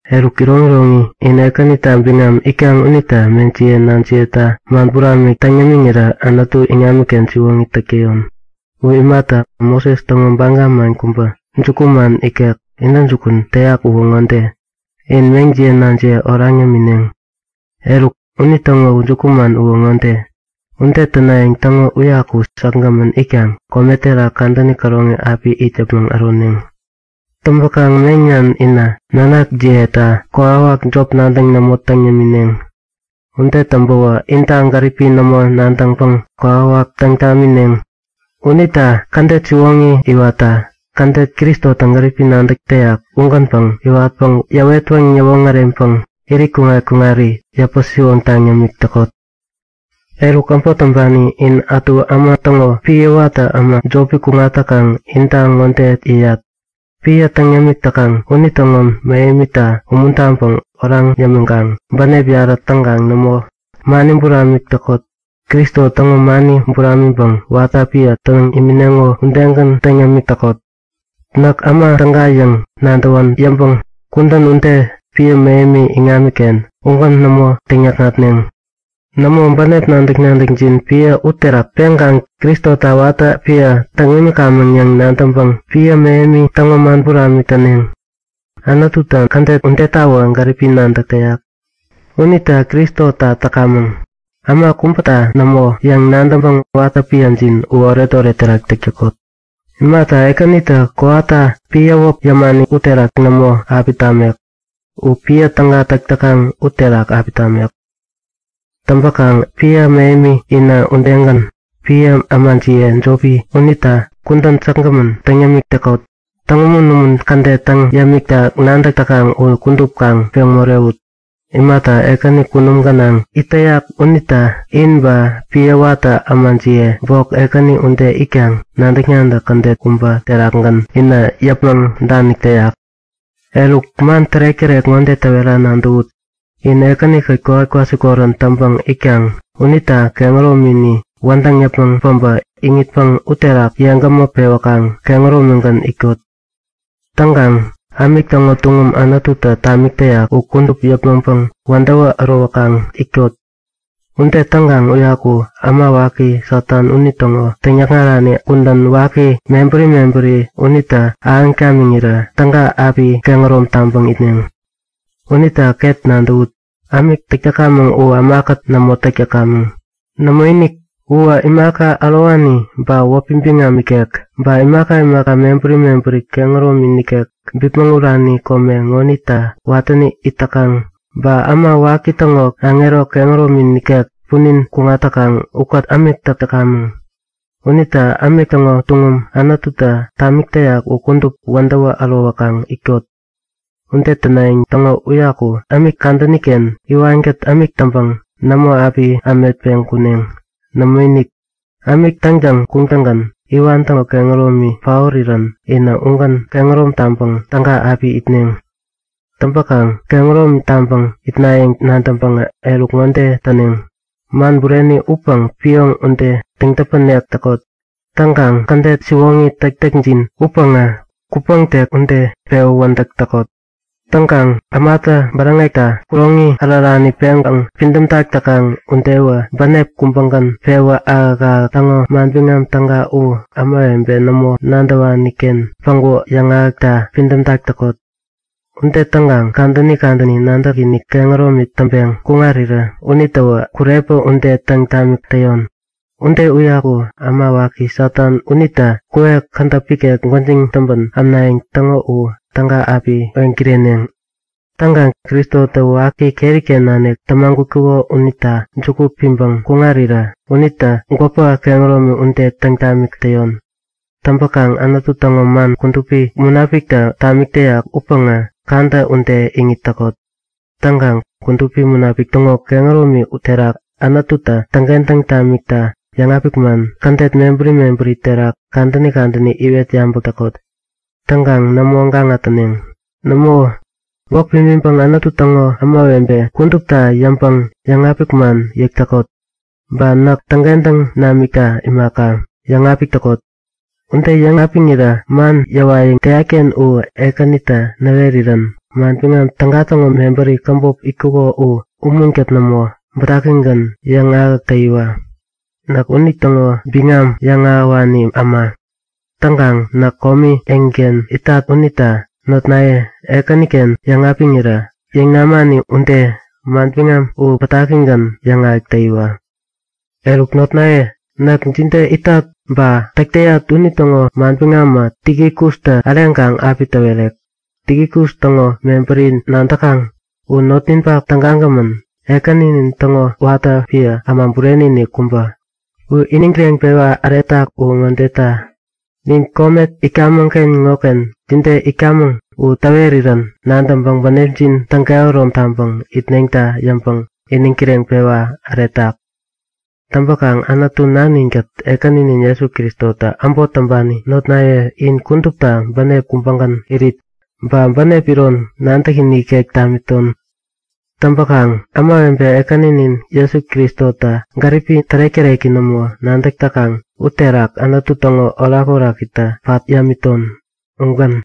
Eruk iroŋiroŋi, in Ekänita biŋam itkaŋ unita meŋjiye nanjiyeta man buramik täŋ yämiŋirä Anutu iŋamiken siwoŋi täk täyon. U imata, Moses täŋo baga man kubä, jukuman ikek intäjukun täyak uwä ŋode; In meŋjiye nanjiye oraŋ yämineŋ. Eruk, unitäŋo jukuman uwä ŋode; Ude tänayäŋ täŋo uyaku säkgämän itkaŋ kome terak kadäni käroŋi api it yäpmäŋ äroneŋ. Täŋpäkaŋ meŋnan inä nanakjiyeta kokwawak jop nadäŋ nämo täŋ yämineŋ. Ude täŋpäwä inta gäripi nämo nadäŋpäŋ kokwawak nadäŋ tamineŋ. Unita kädet siwoŋi iwatta, kädet Kristotä gäripi nadäk täyak ugänpäŋ yäwetpäŋ yäwoŋäreŋpäŋ irit kuŋat-kuŋari yäpä-siwoŋtaŋ yämik täkot. Eruk, äbot täŋpani in ätu äma täŋo piä watä äma jopi kuŋat täkaŋ inta ŋode yäyat; Piä täŋ yämik täkaŋ unitäŋo mähemita umuntaŋpäŋ oraŋ yämiŋkaŋ bänep yarä täŋkaŋ nämo, mani buramik täkot. Kristo täŋo mani buramiŋpäŋ watä piä täŋ imineŋo udegän täŋ yämik täkot. Näk äma täga yäŋ nadäwän yäŋpäŋ kudän ude piä mähemi iŋamiken ugän nämo täŋyäkŋatneŋ. Nämo, bänep nadäk-nadäkjin piä uterak peŋkaŋ Kristota watä piä täŋ imikamäŋ yäŋ nadäŋpäŋ piä mähemi täŋo man buramik täneŋ. Anututä kädet udetawä gäripi nadäk täyak. Unita Kristota täkamäŋ, äma kubäta nämo yäŋ nadäŋpäŋ watä piäjin u oretoret terak täk täkot. Imata, Ekänitä kowata piä wäp yäpani uterak nämo api tamek. U piä täga täk täkaŋ uterak api tamek. Täŋpäkaŋ piä mähemi inä udegän, piä ämajiye jopi unita kudän säkgämän täŋ yämik täkot. Täŋumun-umun kädet täŋ yämikta nadäk täkaŋ u kudup kaŋ peŋ morewut. Imata, Ekäni kunum gänaŋ it täyak unitä in ba piä watä ämajiye bok Ekäni ude itkaŋ nadäk-nadäk kädet kubä terakgän inä yäpmäŋ danik täyak. Eruk, man tärek-tärek ŋode täwera nadäwut; In Ekäni-kät kowat kwasikorän täŋpäŋ itkaŋ unita kehäromini wädäŋ yäpmäŋ päbä iŋitpäŋ uterak yeŋgämä pewäkaŋ kehäromigän itkot. Täŋkaŋ ämik täŋo tuŋum Anututä tamik täyak u kudup yäpmäŋpäŋ wädäwä ärowäkaŋ itkot. Ude täŋkaŋ uyaku äma waki Satan unitäŋo täŋyäkŋarani kudän waki mebäri mebäri unitä ahäŋ tamiŋirä täga api kehärom taŋpäŋ itneŋ. Unita ket nadäwut; Ämik täk täkamäŋ u ämakät nämo täk täkamäŋ. Nämoinik! Uwä imaka ärowani ba wäpi biŋam ikek, ba imaka imaka mebäri mebäri kehäromi nikek bipmäŋ urani kome ŋonita watäni it täkaŋ, ba äma waki täŋo aŋero kehäromi nikek punin kuŋat täkaŋ ukät ämik täk täkamäŋ. Unita ämik täŋo tuŋum Anututä tamik täyak u kudup wädäwä ärowäkaŋ itkot. Ude tänayäŋ täŋo uyaku ämik kadäni-ken iwankät ämik täŋpäŋ nämo api ämetpeŋ kuneŋ. Nämoinik, ämik täŋtäŋ kuŋtäŋgän iwan täŋo kehäromi paorirän inä ugän kehärom taŋpäŋ täga api itneŋ. Täŋpäkaŋ kehärom taŋpäŋ itnayäŋ nadäŋpäŋä eruk ŋode täneŋ; Man bureni upäŋ pioŋ ude täŋ-täpänek täkot. Täŋkaŋ kädet siwoŋi täktäkjin upäŋä kupäŋtek ude pewä wädäk täkot. Täŋkaŋ ämatä bäräŋekta kuroŋi ärärani peŋpäŋ pidämtak täkaŋ udewä bänep kubägän pewä ahäk-ahäk täŋo Manbiŋam Täga u ämawebe nämo nadäwani-ken päŋku yäŋahäkta pidämtak täkot. Ude täŋkaŋ kadäni kadäni nadäkinik kehäromi täŋpeŋ kuŋarirä unitäwä kurepä ude täŋ tamik täyon. Ude uyaku äma waki Satan unitä kuwek kädäp ikek gwäjiŋ täŋpän ämnayäŋ täŋo u täga api weŋkireneŋ. Täŋkaŋ Kristotä waki keri-ken nanik tämagutkuko unita juku piŋpäŋ kuŋarirä unitä gwäpä kehäromi ude täŋ tamik täyon. Täŋpäkaŋ Anutu täŋo man Kudupi Munapiktä tamik täyak upäŋä kadä ude iŋit täkot. Täŋkaŋ Kudupi Munapik täŋo kehäromi terak Anututä täŋkentäŋ tamikta yäŋapik man kädet mebäri mebäri terak kadäni kadäni iwet yabäk täkot. Täŋkaŋ nämo gaŋa täneŋ. Nämo, gwäk pimiŋpäŋ Anutu täŋo kudupi ämawebe kudupta yäŋpäŋ yäŋapik man yäk täkot. Ba näk täŋkentäŋ namikta imaka, yäŋapik täkot. Ude yäŋapiŋirä man yäwayäŋ täyat-ken u Ekänitä näwerirän Manbiŋam Täga täŋo mebäri käbop itkuko u umunkät nämo, bätakigän yäŋahäk täyiwa. Näk unitäŋo biŋam yäŋahäwani äma. Täŋkaŋ näk komi eŋiken itat unita notnaye, Ekäniken yäŋapiŋirä yäŋ namani ude, manbiŋam u bätakigän yäŋahäk täyiwa. Eruk notnaye, näk jide itat ba täk täyat unitäŋo manbiŋamä Tikikustä äreŋkaŋ api täwerek. Tikikus täŋo mebäri nadäkaŋ; U notninpak tägagämän, Ekäninin täŋo watä piä äma bureni-inik kubä. U iniŋ kireŋpewa äretak uwä ŋodeta; Nin kome itkamäŋ-ken ŋoken jide itkamäŋ u täwerirän nadäŋpäŋ bänepjin täŋkehärom taŋpäŋ itneŋta yäŋpäŋ iniŋ kireŋpewa äretak. Täŋpäkaŋ Anutu Nanin-kät Ekäninin Jesu Kristotä äbot täŋpani notnaye in kudupta bänep kubägän irit, ba bänep iron nadäkinik ikek tamiton. Täŋpäkaŋ ämawebe Ekäninin Jesu Kristota gäripi tärek-täreki nämo nadäk täkaŋ uterak Anutu täŋo orakorakitä pat yämiton. Ugän.